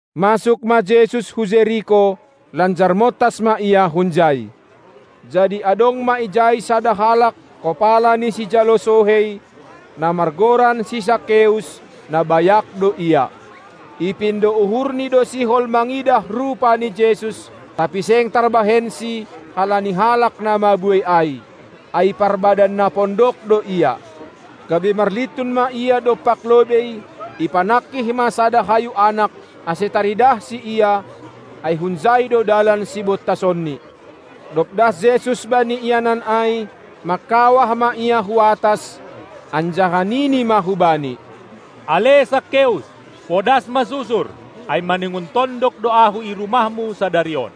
Masuk ma Jesus hu Jeriko, lanjar montas ma Ia hunjai. Jadi adong ma ijai sada halak, kopala ni sijalo sohei, na margoran si Sakeus; na bayak do ia. Ipindo uhurni do sihol mangidah rupa ni Jesus, tapi seng tarbahensi halani halak na mabuei ai, ai parbadan na pondok do ia. Gabe marlintun ma ia dompak lobei, ipanangkih ma sada hayu anak, ase taridahsi Ia, ai hunjai do dalan sibontasonni. Dob das Jesus bani ianan ai, mangkawah ma Ia hu atas, anjaha nini ma hubani: Ale Sakeus! Podas ma susur, ai maningon tondok do Ahu i rumahmu sadari on!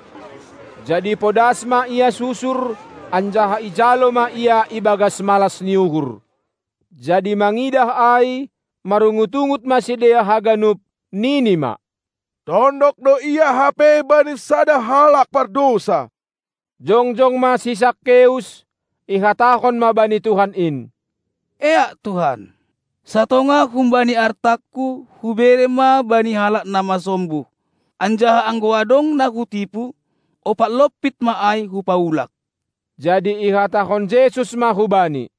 Jadi podas ma ia susur, anjaha ijalo ma Ia ibagas malas ni uhur. Jadi mangidah ai, marungut-ungut ma sidea haganup, nini ma: Tondok do Ia hape bani sada halak pardousa! Jongjong ma si Sakeus, ihatahon ma bani Tuhan in: Eak Tuhan, satongah humbani artangku hubere ma bani halak na masombuh, anjaha anggo adong na hutipu, ompat lompit ma ai hupaulak. Jadi ihatahon Jesus ma hubani: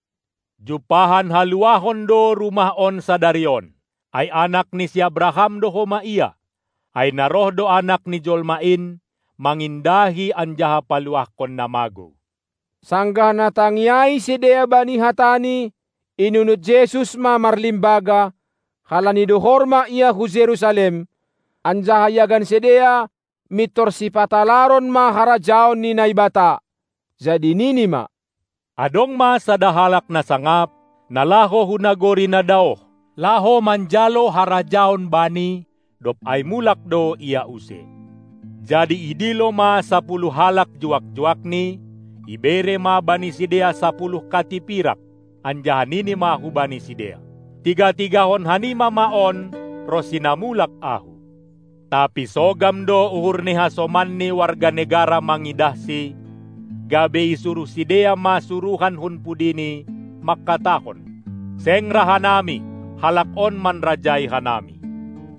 Jumpahan haluahon do rumah on sadari on, ai anak ni si Abrahan do homa ia. Ai na roh do Anak ni jolma in mangindahi anjaha paluahkon na magou. Sanggah na tangi ai sidea bani hataNi, inunut Jesus ma marlimbaga, halani dohor ma Ia hu Jerusalem, anjaha iagan sidea, mintor sipatalaron ma harajaon ni Naibata. Jadi Nini ma: Adong ma sada halak na sangap, na laho hu nagori na daoh, laho manjalo harajaon bani, dob ai mulak do ia use. Jadi idilo ma sapuluh halak juak-juakni, ibere ma bani sidea sapuluh kati pirak, anjaha nini ma hubani sidea: Tiga-tigahon hanima ma on ronsi na mulak ahu! Tapi sogam do uhur ni hasomanni warga negara mangidahsi, gabe i suruh sidea ma suruhan hun pudini, mangkatahon: Seng ra hanami, halak on manrajai hanami!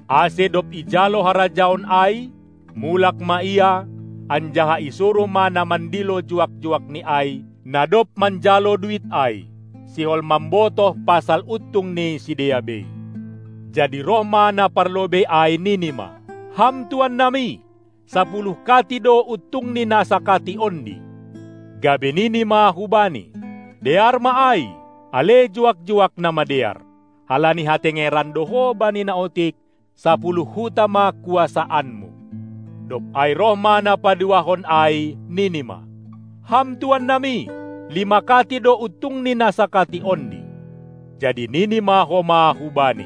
Ase dob ijalo harajaon ai, mulak ma ia, anjaha isuruh ma na mandilo juak-juakni ai, na dob manjalo duit ai, sihol mambotoh pasal untung ni sidea bei. Jadi roh ma na parlobei ai, nini ma: Ham tuan nami, sapuluh kati do untung ni na sakati ondi! Gabe nini ma hubani: Dear ma ai, ale juak-juak na madear! Halani hatengeran do ho bani na otik, sapuluh huta ma kuasaanmu. Dob ai roh ma na paduahon ai, nini ma: Ham tuan nami, lima kati do untung ni na sakati ondi! Jadi nini ma homa hubani: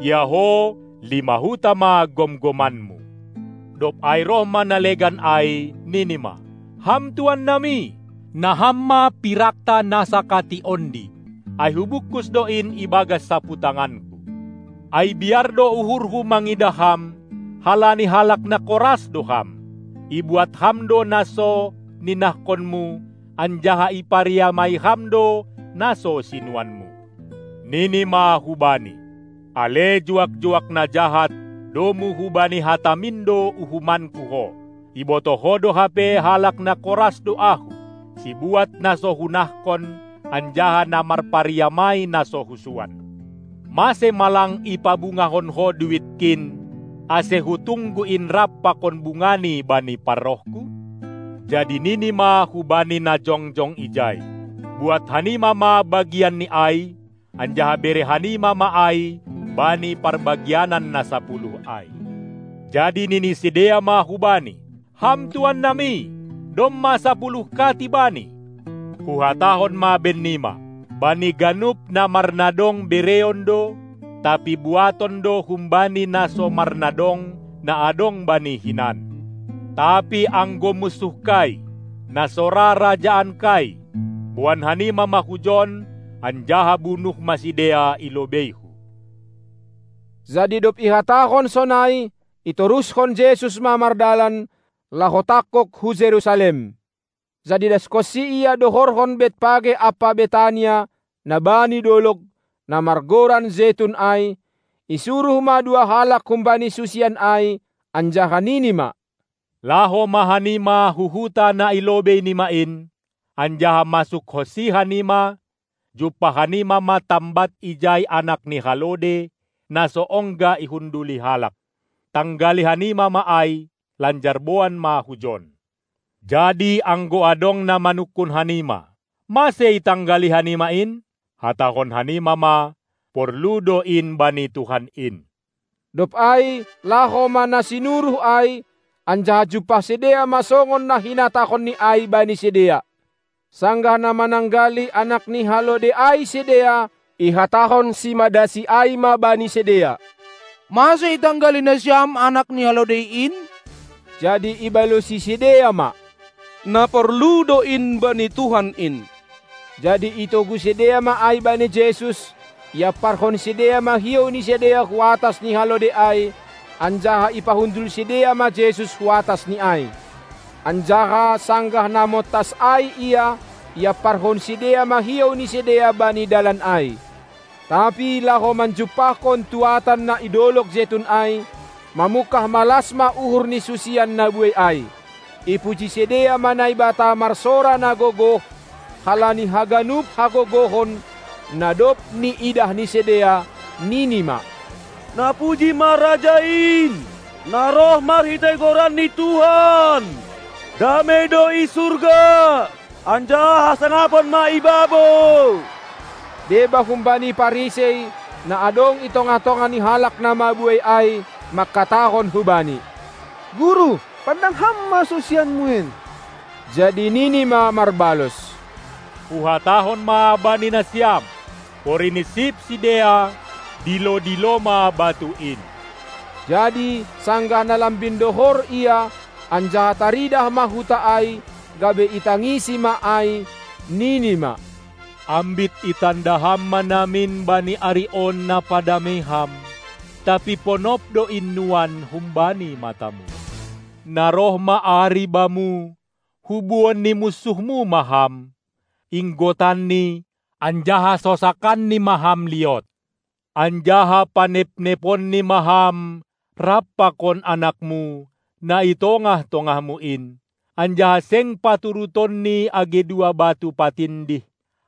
Ia ho, lima huta ma gomgomanmu! Dob ai roh ma na legan ai, nini ma: Ham tuan nami, na ham ma pirakta na sakati ondi, ai hubungkus do in ibagas saputanganku. Ai biar do uhurhu mangidah ham, halani halak na koras do ham. Ibuat ham do na so ninahkonmu anjaha ipariamai ham do na so sinuanmu. Nini ma hubani: Ale juak-juak na jahat, domu hubani hatamin do uhumanku ho! Ibotoh ho do hape halak na koras do ahu, sibuat na so hunahkon anjaha na marpariamai na so husuan. Mase ma lang ipabungahon ho duitkin, ase hutunggu in rap pakon bungani bani parrohku? Jadi nini ma hubani na jongjong ijai: Buat hanima ma bagianni ai, anjaha bere hanima ma ai bani parbagian na sapuluh ai! Jadi nini sidea ma hubani: Ham tuan nami, domma sapuluh kati bani! Huhatahon ma bennima: Bani ganup na marnadong bereon do, tapi buaton do humbani na so marnadong na adong bani hinan. Tapi anggo munsuhkai, na so ra rajaankai, boan hanima ma hujon, anjaha bunuh ma sidea i lobeihu. Jadi dob ihatahon sonai, itoruskon Jesus ma mardalan, laho tangkog hu Jerusalem. Jadi dashonsi Ia dohorhon Betpage ampa Betania, na bani dolog, na margoran Jetun ai, isuruh ma dua halak humbani susian ai, anjaha nini ma: Laho ma hanima hu huta na i lobei nima in, anjaha masukhonsi hanima, jumpah hanima ma tambat ijai anak ni halode, na so ongga ihunduli halak. Tanggali hanima ma ai, lanjar boan ma hujon! Jadi anggo adong na manungkun hanima: Mase itanggali hanima in? hatahon hanima ma: Porlu do in bani Tuhan in. Dob ai laho ma na sinuruh ai, anjaha jumpah sidea ma songon na hinatahonNi ai bani sidea. Sanggah na mananggali anak ni halode ai sidea, ihatahon simadasi ai ma bani sidea: Mase itanggali nasiam anak ni halode in? Jadi ibalosi sidea ma: Na porlu do in bani Tuhan in! Jadi itogu sidea ma ai bani Jesus; iamparhon sidea ma hiou ni sidea hu atas ni halode ai, anjaha ipahundul sidea ma Jesus hu atas ni ai. Anjaha, sanggah na montas ai Ia, iamparhon sidea ma hiou ni sidea bani dalan ai. Tapi laho manjumpahkon tuadan na i dolog Jetun ai, mamungkah malas ma uhur ni susian na buei ai, ipuji sidea ma Naibata marsora na gogoh halani haganup hagogohon, na dob niidah ni sidea, nini ma: Napuji ma Raja in, na roh marhitei goran ni Tuhan! Damei do i surga, anjaha hasangapon ma i babou! Deba humbani Parisei, na adong i tongah-tongah ni halak na mabuei ai, mangkatahon hu Bani: Guru, pandang ham ma susianmu in. Jadi Nini ma marbalos: Huhatahon ma bani nasiam: Porini sip sidea, dilo-dilo ma batu in! Jadi, sanggah na lambin dohor Ia, anjaha taridah ma huta ai, gabe itangisi ma ai, Nini ma: Ambit itanda ham ma namin bani ari on na padamei ham! Tapi ponop do in nuan humbani matamu. Na roh ma ari bamu, hubuon ni munsuhmu ma ham, inggotanni anjaha sosakanni ma ham liot. Anjaha panepneponni ma ham rap pakon anakmu, na i tongah-tongahmu in, anjaha seng paturutonni age dua batu patindih,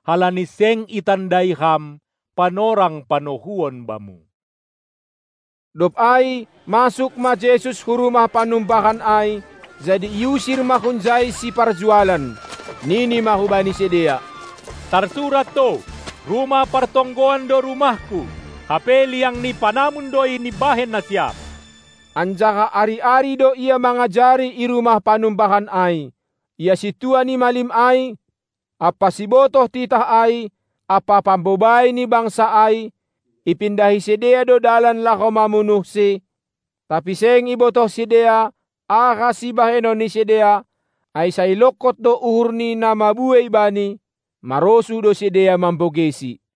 halani seng itandai ham panorang panohuon bamu. Dob ai masuk ma Jesus hu rumah panumbahan ai, jadi iusir ma hunjai siparjualan. Nini ma hubani sidea: Tarsurat do, rumah partonggoan do RumahKu, hape liang ni panamum do in ibahen nasiam. Anjaha ari-ari do Ia mangajari i rumah panumbahan ai. Ia sintua ni malim ai ampa sibotoh titah ai ampa pambobai ni bangsa ai, ipindahi sidea do dalan laho mamunuhSi, tapi seng ibotoh sidea, aha sibahenon ni sidea, ai sai longkot do uhur ni na mabuei Bani, marosuh do sidea mambogeiSi.